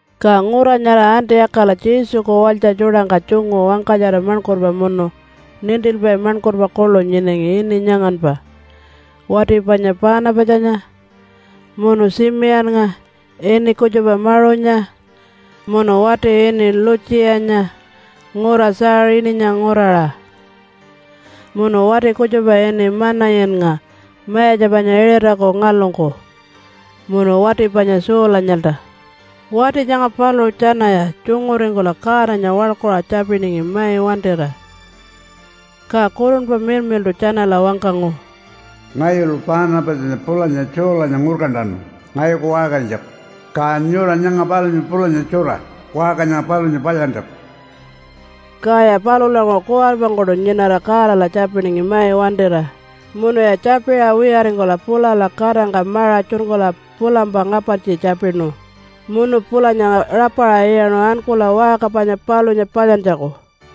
Ka ngura nyara Antiyakala Jesuku walytja tjuṯangka tjungu wangkatjara maṉkurpa munu nintilpai maṉkurpa kuḻu nyinangi ini nyanganpa wati panya Paanapatjanya, munu Tjimiyannga ini kutjupa Maṟunya, munu wati ini Lutjiyanya ngura Tjaaṟininya nguraṟa, munu wati kutjupa ini Manayinnga mayatja panya Iṟataku ngalungku, munu wati panya Saulanyalta. Wati nyanga paluṟu tjanaya tjunguringkula Godanya waḻkuṟa tjapiningi mai wantira, ka Kurunpa Miḻmiḻṯu tjanala wangkangu, “Ngayulu Paanapatjanya pulanya Saulanya ngurkantanu ngayuku waṟkarinytjaku, ka nyura nyanga palunya pulanya tjura waṟka nyanga palunya palyantjaku.” Kaya palulanguṟu kuwaripangkuṯu nyinara Godala tjapiningi mai wantira, munuya tjapiṟa wiyaringkula pulala katangka maṟa tjunkula pulampa ngapartji tjapinu munu pulanya rapaṟa iyaṉu ankula waṟka panya palunya palyantjaku.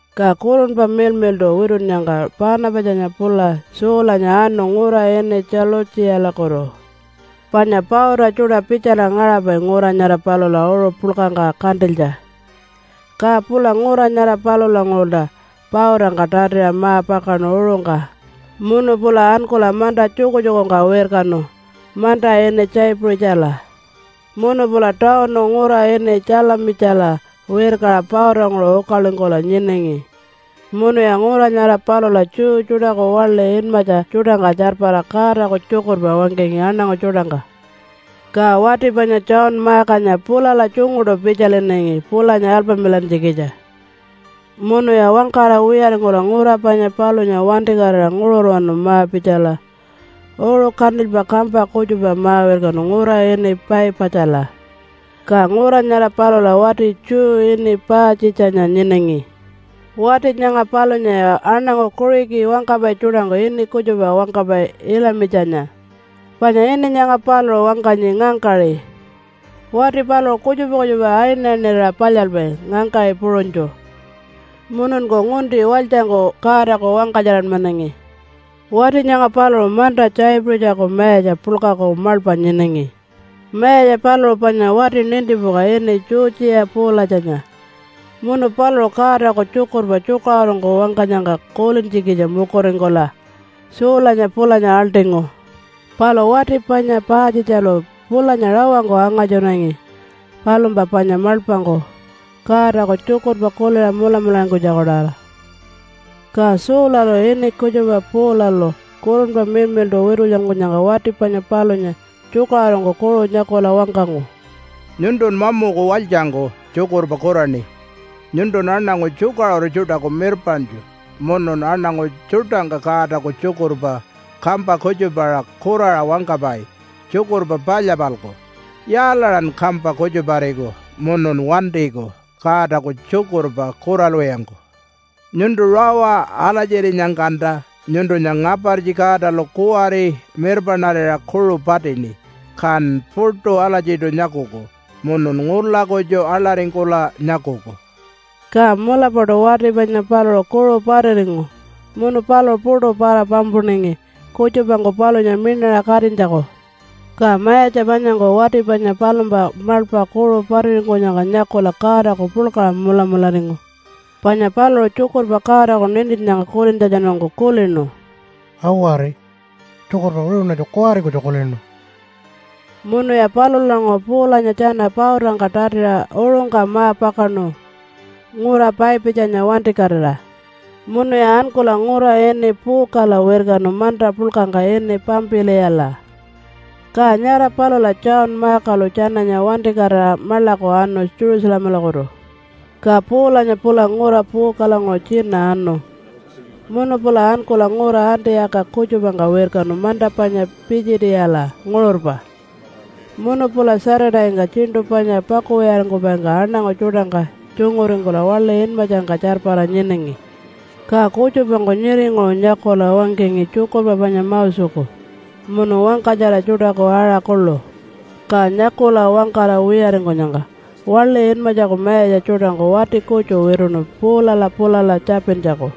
Ka Kurunpa Miḻmiḻṯu witunnyangka Paanapatjanya pula Saulanya anu ngura ini Tjalutjiyalakutu, panya pauta tjuṯa pitjala ngaṟapai ngura nyara palula uṟu puḻkangka kantilytja. Ka pula ngura nyara palulanguṟulta pautangka tatiṟa ma-pakaṉu uṟungka munu pula ankula manta tjukutjukungka wirkanu manta ini Tjaipuṟitjala. Munu pula tawunu ngura ini Tjalamitjala wirkaṟa pautanguṟu ukalingkula nyinangi munuya ngura nyara palula Jew tjuṯaku waḻi inmatja tjuṯangka tjarpara Godaku tjukurpa wangkangi aṉangu tjuṯangka. Ka wati panya John Markanya pulala tjunguṯu pitjalinangi pulanya alpamilantjikitja. Munuya wangkara wiyaringkula ngura panya palunya wantikatira nguṟurwanu ma-pitjala uṟu kantilypa kampa kutjupa ma-wirkanu ngura ini Paipatjala. Ka ngura nyara palula wati Jew ini Paatjitjanya nyinangi. Wati nyanga palunyaya aṉangu Kuṟiki wangkapai tjuṯangku ini kutjupa wangkapai Ilimatjanya, panya ini nyanga paluṟu wangkanyi, ngangkaṟi. Wati paluṟu kutjupa kutjupa ayinayinirira palyalpai ngangkaṟi puṟunytju, mununku ngunti walytjangku Godaku wangkatjaranmanangi. Wati nyanga paluṟu manta Tjaipuṟitjaku mayatja puḻkaku maḻpa nyinangi. Mayatja paluṟu panya wati nintipuka ini Tjutjiya Puulatjanya munu paluṟu Godaku tjukurpa tjukaṟurungku wangkanyangka kulintjikitja mukuringkula Saulanya pulanya aḻṯingu. Palu wati panya Paatjitjalu pulanya rawangku angatjunangi palumpa panya maḻpangku Godaku tjukurpa kuliṟa mulamularingkunytjaku-tawara. Ka Saulalu, ini kutjupa Paulalu, Kurunpa Miḻmiḻṯu witulyankunyangka wati panya palunya tjukaṟurungku kuṟu nyakula wangkangu, “Nyuntun mamuku walytjangku tjukurpa kuraṉi! Nyuntun aṉangu tjukaṟuru tjuṯaku mirpaṉtju munun aṉangu tjuṯangka Godaku tjukurpa kampa kutjupaṟa kuraṟa wangkapai tjukurpa palya-palku. Yaalaṟan kampa kutjupariku munun wantiku Godaku tjukurpa kuralwiyangku? Nyuntu rawa alatjirinyangkanta nyuntunya ngapartji Godalu kuwari mirpaṉarira kuṟu patini, kan puṯu alatjiṯu nyakuku munun ngula kutju aḻaringkula nyakuku.” Ka mulapaṯu wati panya paluṟu kuṟu patiringu munu paluṟu puṯu para-pampuningi kutjupangku palunya miṉaṟa katinytjaku. Ka mayatja panyangku wati panya palumpa maḻpa kuṟu patiringkunyangka nyakula Godaku puḻkaṟa mulamularingu. Panya paluṟu tjukurpa Godaku nintinnyangka kulintjatjanungku kulinu, “Awari! Tjukurpa wiṟuṉatju kuwari kutju kulinu.” Munuya palulanguṟu Paulanya tjana pautangka tatiṟa uṟungka ma-pakaṉu ngura Paipatjanya wantikatira, munuya ankula ngura ini Puukala wirkanu manta puḻkangka ini Pampiliyala. Ka nyara palula John Markalu tjananya wantikatira maḻaku anu Jerusalemalakutu. Ka Paulanya pula ngura Puukalanguṟu tjina anu munu pula ankula ngura Antiyaka kutjupangka wirkanu manta panya Pitjitiyala nguṟurpa. Munu pula Saturday-ngka tjiṉṯu panya pakuwiyaringkupaingka aṉangu tjuṯangka tjunguringkula waḻi inmatjangka tjarpara nyinangi. Ka kutjupangku nyiringuṟu nyakula wangkangi tjukurpa panya Moseku munu wangkatjara tjuṯaku aṟa kuḻu. Ka nyakula wangkara wiyaringkunyangka waḻi inmatjaku mayatja tjuṯangku wati kutju wituṉu Paulala pulala tjapintjaku,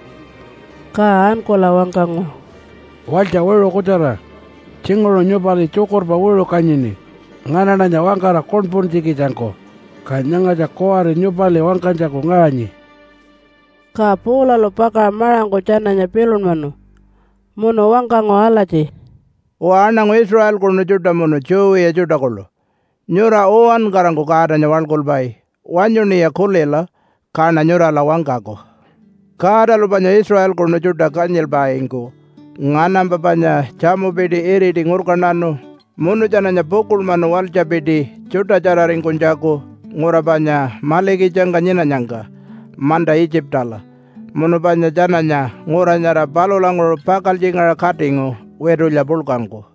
ka ankula wangkangu, “Walytja wiṟu kutjara! Tjinguṟu nyupali tjukurpa wiṟu kanyini nganaṉanya wangkara kuṉpuntjikitjangku. Ka nyangatja kuwari nyupali wangkanytjaku ngaṟanyi.” Ka Paulalu pakaṟa maṟangku tjananya pilunmanu munu wangkangu alatji, “Uwa, aṉangu Israelkunu tjuṯa munu Jew wiya tjuṯa kuḻu, nyura uwankarangku Godanya waḻkulpai. Wanyuṉiya kulila kaṉa nyurala wangkaku! Godalu panya Israelkunu tjuṯa kanyilpaingku nganampa panya tjamupiti iriti ngurkantanu munu tjananya pukuḻmanu walytjapiti tjuṯatjararingkunytjaku ngura panya malikitjangka nyinanyangka manta Itjipala. Munu panya tjananya ngura nyara palulanguṟu pakaltjingaṟa katingu witulya puḻkangku.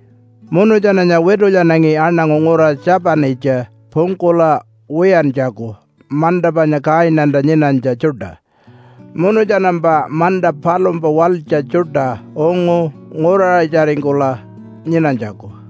Munu tjananya witulyanangi aṉangu ngura 7-itja pungkula wiyantjaku manta panya Kainanta nyinanytja tjuṯa. Munu tjanampa manta palumpa walytja tjuṯa ungu nguraṟitjaringkula nyinanytjaku.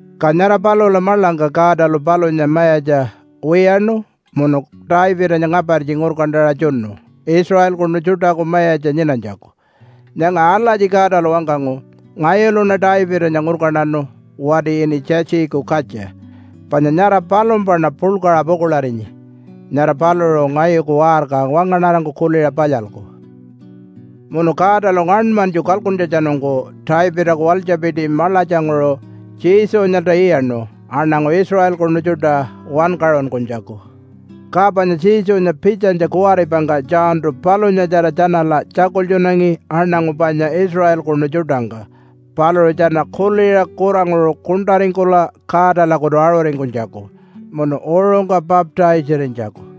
Ka nyara palula maḻangka Godalu palunya mayatja wiyaṉu munu Davidanya ngapartji ngurkantaṟa tjunu Israelkunu tjuṯaku mayatja nyinanytjaku. Nyanga alatji Godalu wangkangu, ‘Ngayuluṉa Davidanya ngurkantanu wati ini Tjiitjiku katja, panya nyara palumpaṉa puḻkaṟa pukuḻarinyi. Nyara paluṟu ngayuku waṟka wangaṉarangku kuliṟa palyalku.’ “Munu Godalu ngaṉmanytju kalkuntjatjanungku Davidaku walytjapiti maḻatjanguṟu Jesunyalta iyaṉu aṉangu Israelkunu tjuṯa wankaṟunkunytjaku. Ka panya Jesunya pitjanytja kuwaripangka Johntu palunyatjara tjanala tjakultjunangi aṉangu panya Israelkunu tjuṯangka paluṟu tjana kuliṟa kuranguṟu kuṉṯaringkula Godalakutu aṟuringkunytjaku munu uṟungka baptise-arinytjaku.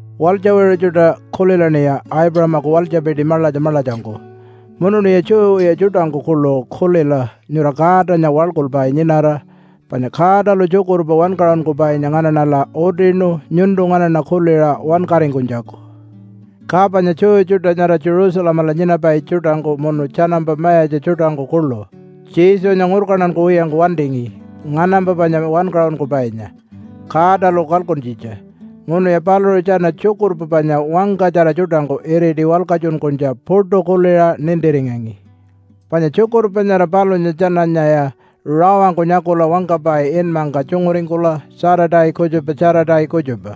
“Walytja wiṟu tjuṯa! Kulilaṉiya Aipuṟamaku walytjapiti maḻatja maḻatjangku! Munuṉiya Jew wiya tjuṯangku kuḻu kulila nyura Godanya waḻkulpai nyinara! Panya Godalu tjukurpa wankaṟunkupainya nganaṉala utinu nyuntu nganaṉa kuliṟa wankaringkunytjaku. Ka panya Jew tjuṯa nyara Jerusalemala nyinapai tjuṯangku munu tjanampa mayatja tjuṯangku kuḻu Jesunya ngurkantankuwiyangku wantingi nganampa panya wankaṟunkupainya Godalu kalkuntjitja. Munuya paluṟu tjana tjukurpa panya wangkatjara tjuṯangku iriti walkatjunkunytja puṯu kuliṟa nintiringangi. Panya tjukurpa nyara palunya tjananyaya rawangku nyakula wangkapai inmangka tjunguringkula Saturday kutjupa Saturday kutjupa.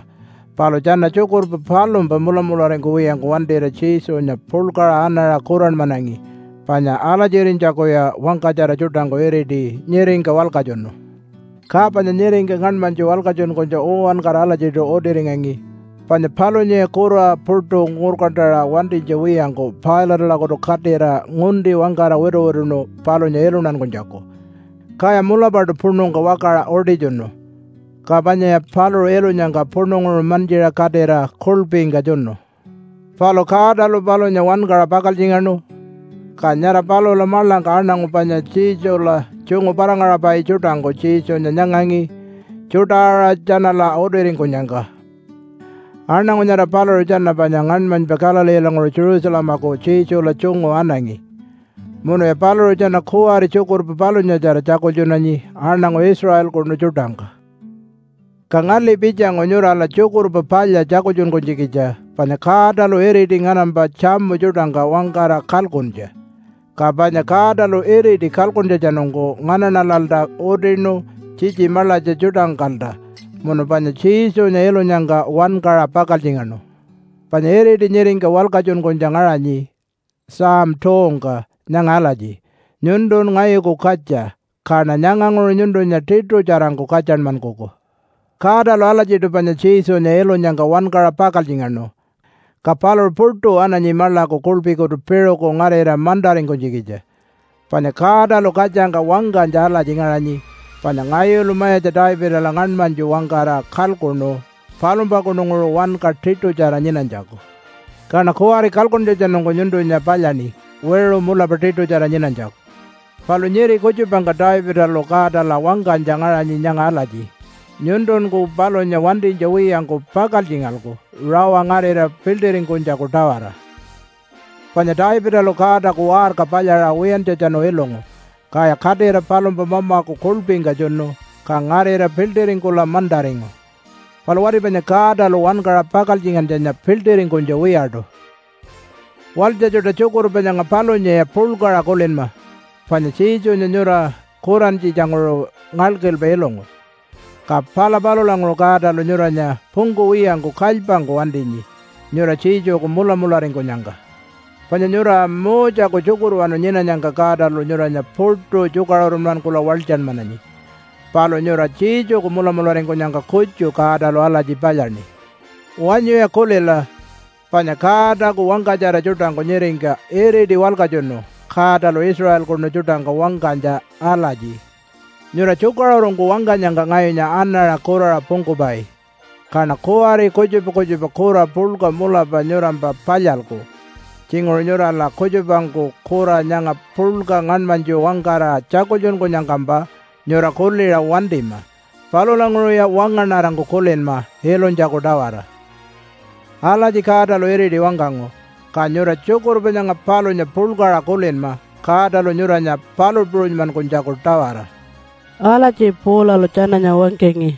Palu tjana tjukurpa palumpa mulamularingkuwiyangku wantira Jesunya puḻkaṟa anaṟa kuranmanangi, panya alatjirinytjakuya wangkatjara tjuṯangku iriti nyiringka walkatjunu. Ka panya nyiringka ngaṉmanytju walkatjunkunytja uwankara alatjiṯu utiringangi. Panya palunyaya kura puṯu ngurkantaṟa wantinytja wiyangku Pilate-alakutu katira ngunti wangkara wituwituṉu palunya iluntankunytjaku, kaya mulapaṯu puṉungka wakaṟa utitjunu. Ka panyaya paluṟu ilunyangka puṉunguṟu mantjiṟa katira kuḻpingka tjunu. Palu Godalu palunya wankaṟa pakaltjingaṉu. Ka nyara palula maḻangka aṉangu panya Jesula tjungu para-ngaṟapai tjuṯangku Jesunya nyangangi tjuṯa-aṟa tjanala utiringkunyangka. Aṉangu nyara paluṟu tjana panya ngaṉmanypa Galileelanguṟu Jerusalemaku Jesula tjungu anangi. Munuya paluṟu tjana kuwari tjukurpa palunyatjara tjakultjunanyi aṉangu Israelkunu tjuṯangka. “Ka ngali pitjangu nyurala Tjukurpa Palya tjakultjunkunytjikitja panya Godalu iriti nganampa tjamu tjuṯangka wangkara kalkuntja. Ka panya Godalu iriti kalkuntjatjanungku nganaṉalalta utinu tjitji maḻatja tjuṯangkalta, munu panya Jesunya ilunyangka wankaṟa pakaltjingaṉu. Panya iriti nyiringka walkatjunkunytja ngaṟanyi Psalm 2-ngka nyanga alatji, ‘Nyuntun ngayuku katja, kaṉa nyanganguṟu nyuntunya tiṯutjarangku katjanmankuku.’ “Godalu alatjiṯu panya Jesunya ilunyangka wankaṟa pakaltjingaṉu, ka paluṟu puṯu ananyi maḻaku kuḻpikutu piṟuku ngarira mantaringkunytjikitja. Panya Godalu katjangka wangkanytja alatji ngaṟanyi, ‘Panya ngayulu Mayatja Davidala ngaṉmanytju wangkara kalkuṉu palumpakununguṟu wanka tiṯutjara nyinanytjaku. Kaṉa kuwari kalkuntjatjanungku nyuntunya palyaṉi wiṟu mulapa tiṯutjara nyinanytjaku.’ “Palu nyiri kutjupangka Davidalu Godala wangkanytja ngaṟanyi nyanga alatji, ‘Nyuntunku palunya wantinytja wiyangku pakaltjingalku rawa ngarira piḻṯiringkunytjaku-tawara.’ Panya Davidalu Godaku waṟka palyaṟa wiyantjatjanu ilungu, kaya katira palumpa mamaku kuḻpingka tjunu, ka ngarira piḻṯiringkula mantaringu. Palu wati panya Godalu wankaṟa pakaltjingantjanya piḻṯiringkunytja wiyaṯu. “Walytja tjuṯa! Tjukurpa nyanga palunyaya puḻkaṟa kulinma! Panya Jesunya nyura kurantjitjanguṟu ngalkilpa ilungu, ka pala palulanguṟu Godalu nyuranya pungkuwiyangku kalypangku wantinyi nyura Jesuku mulamularingkunyangka. Panya nyura Moseku tjukurwanu nyinanyangka Godalu nyuranya puṯu tjukaṟurunmankula walytjanmananyi. Palu nyura Jesuku mulamularingkunyangka kutju Godalu alatji palyaṉi. Wanyuya kulila, panya Godaku wangkatjara tjuṯangku nyiringka iriti walkatjunu Godalu Israelkunu tjuṯangka wangkanytja alatji, ‘Nyura tjukaṟurungku wangkanyangka ngayunya anaṟa kuraṟa pungkupai. Kaṉa kuwari kutjupa kutjupa kura puḻka mulapa nyurampa palyalku. Tjinguṟu nyurala kutjupangku kura nyanga puḻka ngaṉmanytju wangkara tjakultjunkunyangkampa nyura kuliṟa wantima. Palulanguṟuya wangaṉarangku kulinma ilunytjaku-tawara.’ Alatji Godalu iriti wangkangu. Ka nyura tjukurpa nyanga palunya puḻkaṟa kulinma Godalu nyuranya palu puṟunymankunytjaku-tawara.” Alatji Paulalu tjananya wangkangi.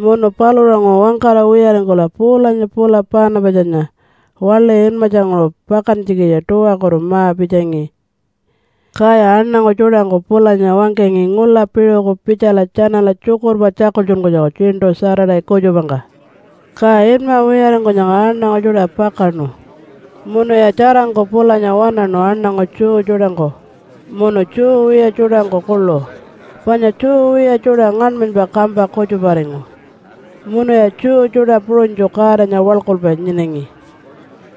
Munu palulanguṟu wangkara wiyaringkula Paulanya pula Paanapatjanya waḻi inmatjanguṟu pakantjikitja tuwakutu ma-pitjangi, kaya aṉangu tjuṯangku pulanya wangkangi ngula piṟuku pitjala tjanala tjukurpa tjakultjunkunytjaku tjiṉṯu Saturday kutjupangka. Ka inma wiyaringkunyangka aṉangu tjuṯa pakaṉu munuya tjarangku pulanya waṉaṉu aṉangu Jew tjuṯangku munu Jew wiya tjuṯangku kuḻu, panya Jew wiya tjuṯa ngaṉmanypa kampa kutjuparingu munuya Jew tjuṯa puṟunytju Godanya waḻkulpai nyinangi.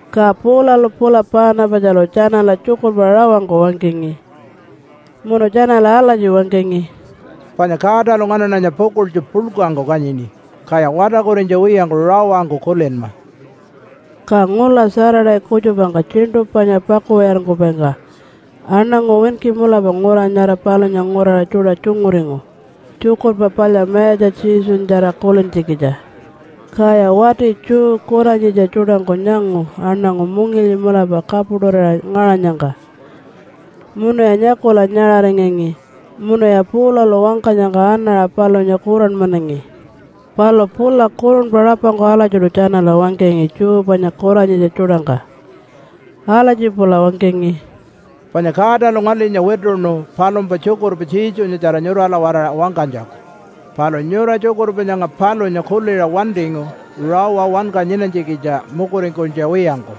Ka Paulalu pula Paanapatjalu tjanala tjukurpa rawangku wangkangi munu tjanala alatji wangkangi, “Panya Godalu nganaṉanya pukuḻtju puḻkangku kanyini, kaya watarkurinytja wiyangku rawangku kulinma.” Ka ngula Saturday kutjupangka tjiṉṯu panya pakuwiyaringkupaingka aṉangu winki mulapa ngura nyara palunya nguraṟa tjuṯa tjunguringu Tjukurpa Palya Mayatja Jesunyatjara kulintjikitja. Kaya wati Jew kuranyitja tjuṯangku nyangu aṉangu mungilyi mulapa kapuṯurira ngaṟanyangka, munuya nyakula nyaṟaringangi munuya Paulalu wangkanyangka anaṟa palunya kuranmanangi. Palu pula kurunpa rapangku alatjiṯu tjanala wangkangi Jew panya kuranyitja tjuṯangka. Alatji pula wangkangi, “Panya Godalu ngalinya wituṉu palumpa tjukurpa Jesunyatjara nyurala-waraṟa wangkanytjaku. Palu nyura tjukurpa nyanga palunya kuliṟa wantingu rawa wanka nyinanytjikitja mukuringkunytja wiyangku.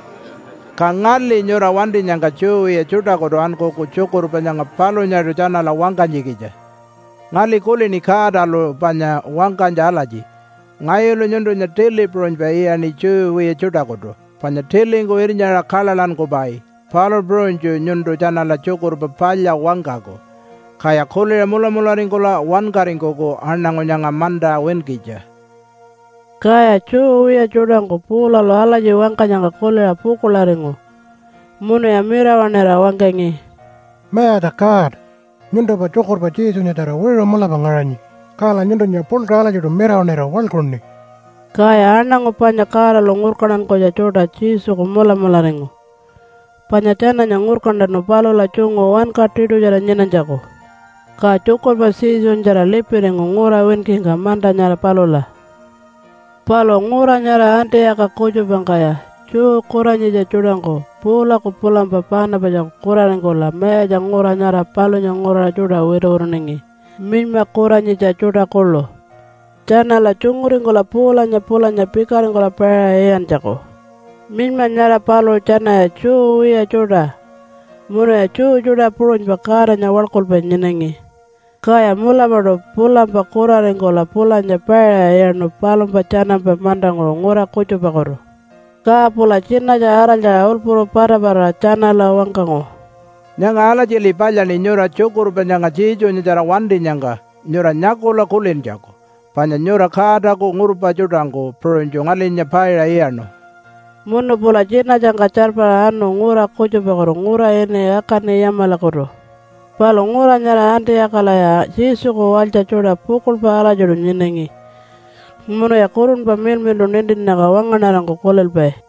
Ka ngali nyura wantinyangka Jew wiya tjuṯakutu ankuku tjukurpa nyanga palunyaṯu tjanala wangkanytjikitja. Ngali kulini Godalu panya wangkanytja alatji, ‘Ngayulu nyuntunya tili puṟunypa iyaṉi Jew wiya tjuṯakutu, panya tilingku irnyaṟa kaḻaḻankupai, palu puṟunytju nyuntu tjanala Tjukurpa Palya wangkaku, kaya kuliṟa mulamularingkula wankaringkuku, aṉangu nyanga manta winkitja.’” Kaya Jew wiya tjuṯangku Paulalu alatji wangkanyangka kuliṟa pukuḻaringu munuya mirawaṉira wangkangi, “Mayatja God! Nyuntumpa tjukurpa Jesunyatjara wiṟu mulapa ngaṟanyi. Kala nyuntunya puḻkaṟa alatjiṯu mirawaṉira waḻkuṉi.” Kaya aṉangu panya Godalu ngurkantankunytja tjuṯa Jesuku mulamularingu, panya tjananya ngurkantanu palula tjungu wanka tiṯutjara nyinanytjaku. Ka tjukurpa Jesunyatjara lipiringu ngura winkingka manta nyara palula. Palu ngura nyara Antiyaka kutjupangkaya Jew kuranyitja tjuṯangku Paulaku pulampa Paanapatjaku kuraringkula mayatja ngura nyara palunya nguraṟa tjuṯa wituwituningi, minyma kuranyitja tjuṯa kuḻu, tjanala tjunguringkula Paulanya pulanya pikaringkula paiṟa iyantjaku. (Minyma nyara paluṟu tjanaya Jew wiya tjuṯa munuya Jew tjuṯa puṟunypa Godanya waḻkulpai nyinangi.) Kaya mulapaṯu pulampa kuraringkula pulanya paiṟa iyaṉu palumpa tjanampa mantanguṟu ngura kutjupakutu. Ka pula tjinatja araltjaṟa ulpuru patapataṟa tjanala wangkangu, “Nyanga alatjili palyaṉi nyura tjukurpa nyanga Jesunyatjara wantinyangka nyura nyakula kulintjaku, panya nyura Godaku ngurpa tjuṯangku puṟunytju ngalinya paiṟa iyaṉu.” Munu pula tjinatjangka tjarpara anu ngura kutjupakutu ngura ini Akani-yamalakutu. Palu ngura nyara Antiyakalaya Jesuku walytja tjuṯa pukuḻpa alatjiṯu nyinangi munuya Kurunpa Miḻmiḻṯu nintinnyangka wangaṉarangku kulilpai.